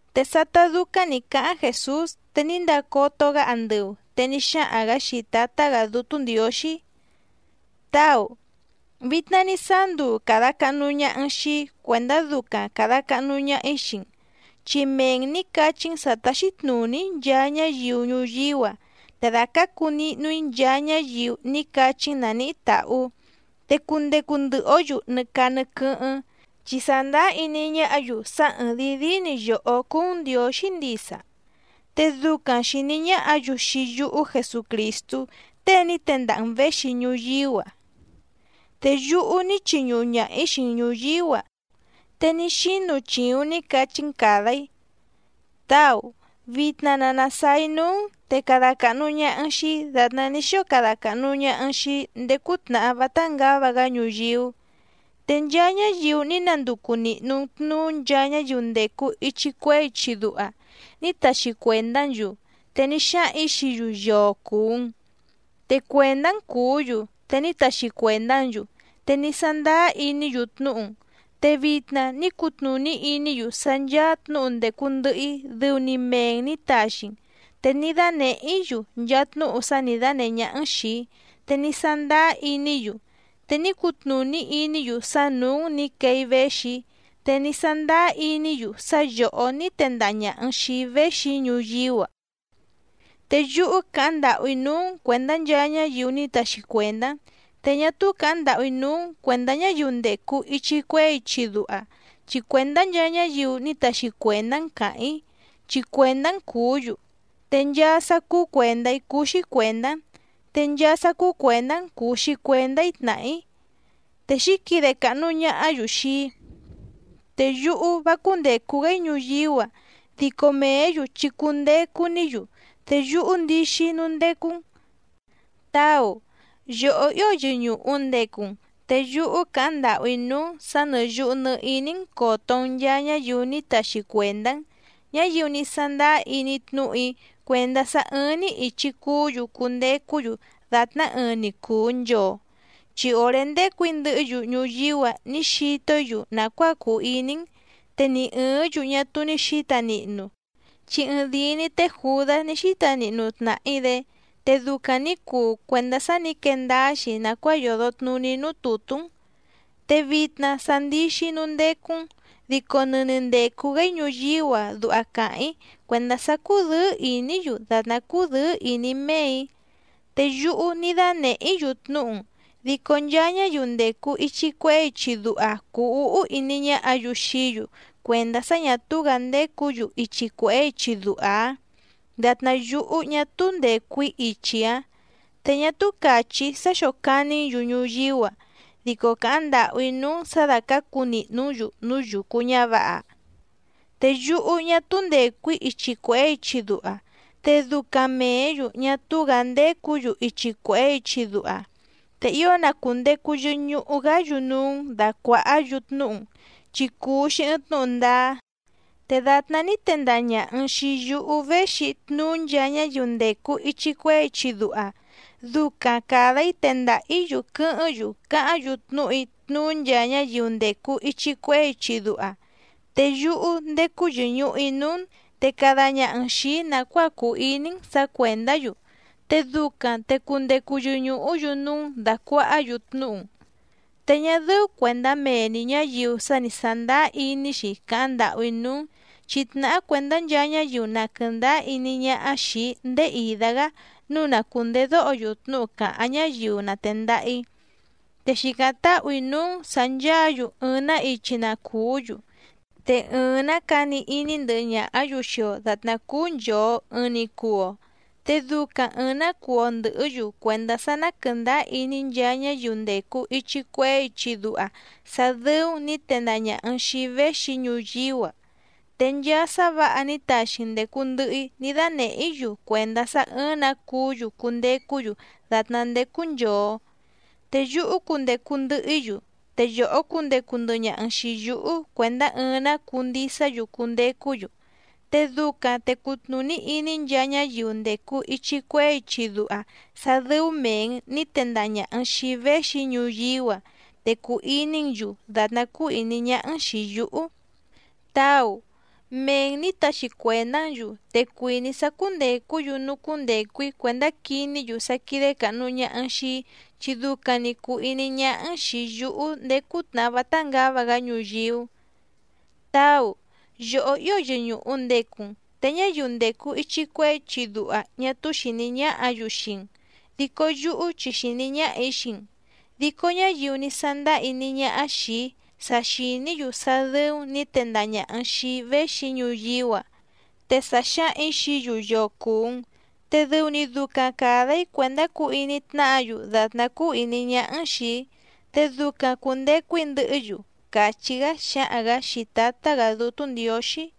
Te sátá dúcáⁿ nǐ cáháⁿ Jèsús te ní ndacoto‑gá andɨu, te ní xáhaⁿ‑gǎ xii Tǎtá‑gǎ Dútú Ndiǒxí: —Táu, vitna ní sáá nduu càda cahnu ñaha‑n xii‑í cuèndá ducaⁿ càda cahnu ñaha‑í xii‑n. Chi mee‑n nǐ cachí‑n sǎ táxí tnùní‑í nchaa ñáyiu ñuyíú‑a, te dàcacu nihnu‑í nchaa ñáyiu ní cachí‑n nàníhí tàhú. Te cundecu ndɨhɨ‑ǒ‑yu nɨ caa nɨ quɨ́hɨ́ⁿ, chi sàndáá iní ñáhǎ‑yu sá ɨ́ɨ́ⁿ dìi díí‑ni yòhó cúú‑n Ndiǒxí ndisa, te ducaⁿ xìní ñáhǎ‑yu xii yúhú Jesucrìstú tée ní tendaha‑n věxi ñuyíú‑a. ’Te yúhú ní chiñuhu ñaha‑ǐ xii‑n ñùyíú‑a, te ní xínu chìuⁿ ní cachí‑n càda‑í. Táu, vitna na nàsáá‑í núú‑n te cada càhnu ñaha‑n xii‑í dàtná ní xóo cada càhnu ñaha‑n xii‑í ndéé cútnàhá vátá ngǎva‑gá ñuyíú. ’Te nchaa ñáyiu ní nanducu nìhnu‑n tnuú nchaa ñáyiu ndècu ichi cuehé ichi duha, ní taxi cuèndá‑n‑yu, te ní xáhaⁿ‑ǐ xií‑yu yoo cùu‑n. Te cuèndá‑n cùú‑yu, te ní taxi cuèndá‑n‑yu, te ní sándáá iní‑yu tnúhu‑n. Te vitna ní cutnùní iní‑yu sá ncháá tnǔhu ndècu ndɨhɨ‑í dɨu‑ni mee‑n nǐ taxi‑n. Te ní dánèhé‑í‑yu nchaa tnúhu sá nǐ dánèhé ñáhá‑n xìi‑í, te ní sándáá iní‑yu. Te ní cutnùní iní‑yu sá nǔú‑n nǐ quee‑í véxi‑í, te ní sándáá iní‑yu sá yòhó ní tendaha ñàha‑n xii‑í véxi‑í ñuyíú‑a. ’Te yúhú càháⁿ ndàhú‑í núú‑n cuèndá nchaa ñáyiu ní taxi cuèndá‑n. Te ñá túú càháⁿ ndàhú‑í núú‑n cuèndá ñáyiu ndècu ichi cuehé ichi duha, chi cuèndá nchaa ñáyiu ní taxi cuèndá‑n càháⁿ‑í, chi cuèndá‑n cùú‑yu. Te nchaa sá cúú cuèndá‑í cúú‑xí cuèndá‑n, te nchaa sá cúú cuèndá‑n cùu‑xi cuendá‑í tnàhá‑í. Te xǐquide càhnu ñahá‑yu xii‑í. ’Te yúhú vá cúndècu‑gá‑í ñuyíú‑a, dico mèé‑yu chi cundecu‑ní‑yu, te yúhú ndixi‑í núú ndécú‑n. Táu, yòhó ío yɨñùhu ndecu‑n, te yúhú càháⁿ ndàhú‑í núú‑n sǎ nɨ́ yùhu nɨ iní‑n còto‑n nchaa ñáyiu ní taxi cuèndá‑n, ñáyiu ní sándáá iní tnúhu‑í cuèndá sá ɨ́ɨ́ⁿ‑ní ìchi cuú‑yu cundecú‑yu dàtná ɨɨⁿ‑ni cùu nchoo. Chi òré ndécù‑í ndɨhɨ́‑yu ñuyíú‑a ní xito‑í‑yu nàcuáa cùu iní‑n, te ni ɨ̀ɨ́ⁿ‑yu ñá túú ní xǐta nihnu, chi ɨɨⁿdìi‑ni té Jùdás ní xíta nihnu tnàhí‑dé, te ducaⁿ nǐ cuu cuèndá sá nǐ quee ndáá‑xi nàcuáa yòdo tnuní núú tùtú‑n. ’Te vitna sa ndixi‑í núú ndécú‑n, dico nɨni ndècu‑gá‑í ñuyíú‑a duha càháⁿ‑í cuèndá sá cúdɨ̌ɨ́ ìní‑yu dàtná cúdɨ̌ɨ́ ìní méè‑í. Te yúhú ní dánèhé‑í‑yu tnúhu‑n, dico nchaa ñáyiu ndècu ichi cuehé ichi duha cùu úhú iní ñáhǎ‑yu xií‑yu cuèndá sá ñà túú‑gǎ ndécǔ‑yu ichi cuèhé ichi duha‑áⁿ dàtná yúhú ñá túú ndècu‑í ichi‑áⁿ. Te ñá túú càchí‑í sá xócàní‑n‑yu ñuyíú‑a, dico càháⁿ ndàhú‑í núú‑n sǎ dácǎcu nìhnú‑n‑yu núú yucu ñǎvǎha. Te yúhú ñá túú ndècu‑í ichi cuèhé ichi duha, te ducaⁿ mèé‑yu ñá túú‑gǎ ndécǔ‑yu ichi cuèhé ichi duha. Te ío na cùndecu yɨhɨ ñuhu‑gá‑yu núú‑n dàcuahá‑yu tnúhu‑n, chi cùu‑xi ɨɨⁿ tnúhu ndáá. Te dàtná ní tendaha ñàha‑n xii yúhú véxi‑í tnuú nchaa ñáyiu ndècu ichi cuehé ichi duha, ducaⁿ càda‑í tendaha‑ǐ‑yu quɨ́hɨ́ⁿ‑yu cáháⁿ‑yu tnúhu‑í tnuú nchaa ñáyiu ndècu ichi cuehé ichi duha. Te yúhú ndécú yɨ̀ñuhu‑í núú‑n, te cada ñaha‑n xìi‑í nàcuáa cùu iní‑n sǎ cuèndá‑yu, te ducaⁿ te cundecu yɨñùhú‑yu núú‑n dàcuahá‑yu tnúhu‑n. ’Te ñá dɨ́ú cuèndá mee‑ni ñǎyiu sa ní sándáá iní‑xi càháⁿ ndàhú‑í núú‑n, chi tnàhá cuèndá nchaa ñáyiu na quɨ̀ndáá iní ñáhá xìi‑í ndéé ìdá‑gá nǔu na cùndedóho‑yu tnúhu cáháⁿ ñáyiu na tèndaha‑í. Te xìcáⁿ táhù‑í núú‑n sǎ ncháǎ‑yu ɨɨⁿ‑nǎ ichi na cùú‑yu, te ɨɨⁿ‑nǎ cani iní ndɨhɨ ñàhá‑yu xii‑o dàtná cúú nchòo ɨɨⁿ‑ni cuu‑o. Te ducaⁿ ɨ̀ɨⁿ‑ná cuu‑o ndɨ̀hɨ́‑yu cuèndá sá ná quɨ̀ndáá iní nchaa ñáyiu ndècu ichi cuehé ichi duha sá dɨ́ú‑n nǐ tendaha ñàha‑n xii‑í véxi‑í ñuyíú‑a. Te nchaa sá vǎha ní taxi‑n ndècu ndɨhɨ‑í ní dánèhé‑í‑yu cuèndá sá ɨ́ɨ́ⁿ‑nǎ cuú‑yu cundecú‑yu dàtná ndécú nchòo. Te yúhú cundecu ndɨhɨ‑í‑yu, te yòhó cundecu ndɨhɨ ñaha‑n xìi yúhú cuèndá ɨɨⁿ‑nǎ cuu ndisá‑yu cundecú‑yu. Te ducaⁿ te cutnùní iní nchaa ñáyiu ndècu ichi cuehé ichi duha sá dɨ́ú mèe‑n ní tendaha ñàha‑n xii‑í véxi‑í ñuyíú‑a, te cùu iní‑n‑yu dàtná cúú ìní ñáhá‑n xìi yúhú. ’Táu, mee‑n nǐ taxi cuèndá‑n‑yu, te cuìní‑í sá cúndècú‑yu núú cúndècu‑í cuèndá quiní‑yu sá quídé càhnu ñaha‑n xii‑í chi ducaⁿ‑ni cùu iní ñáhá‑n xìi yúhú ndéé cútnàhá vátá ngǎva‑gá ñuyíú. Táu, yòhó ío yɨñùhu ndecu‑n. Te ñáyiu ndècu ichi cuehé ichi duha ñá túú xìní ñáhǎ‑yu xii‑n, dico yúhú chi xìní ñáhà‑í xii‑n, dico ñáyiu ní sándáá iní ñáhá xìi‑í sa xìní‑yu sá dɨ́ú‑n nǐ tendaha ñàha‑n xii‑í véxi‑í ñuyíú‑a. Te sa xǎhaⁿ‑ǐ xií‑yu yoo cùu‑n, te dɨu‑ni ducaⁿ càda‑í cuèndá cuu iní tnáhǎ‑yu dàtná cúú ìní ñáhá‑n xìi‑í, te ducaⁿ cùndecu‑í ndɨhɨ́‑yu —càchí‑gá xáhaⁿ‑gǎ xii Tǎtá‑gǎ Dútú Ndiǒxí.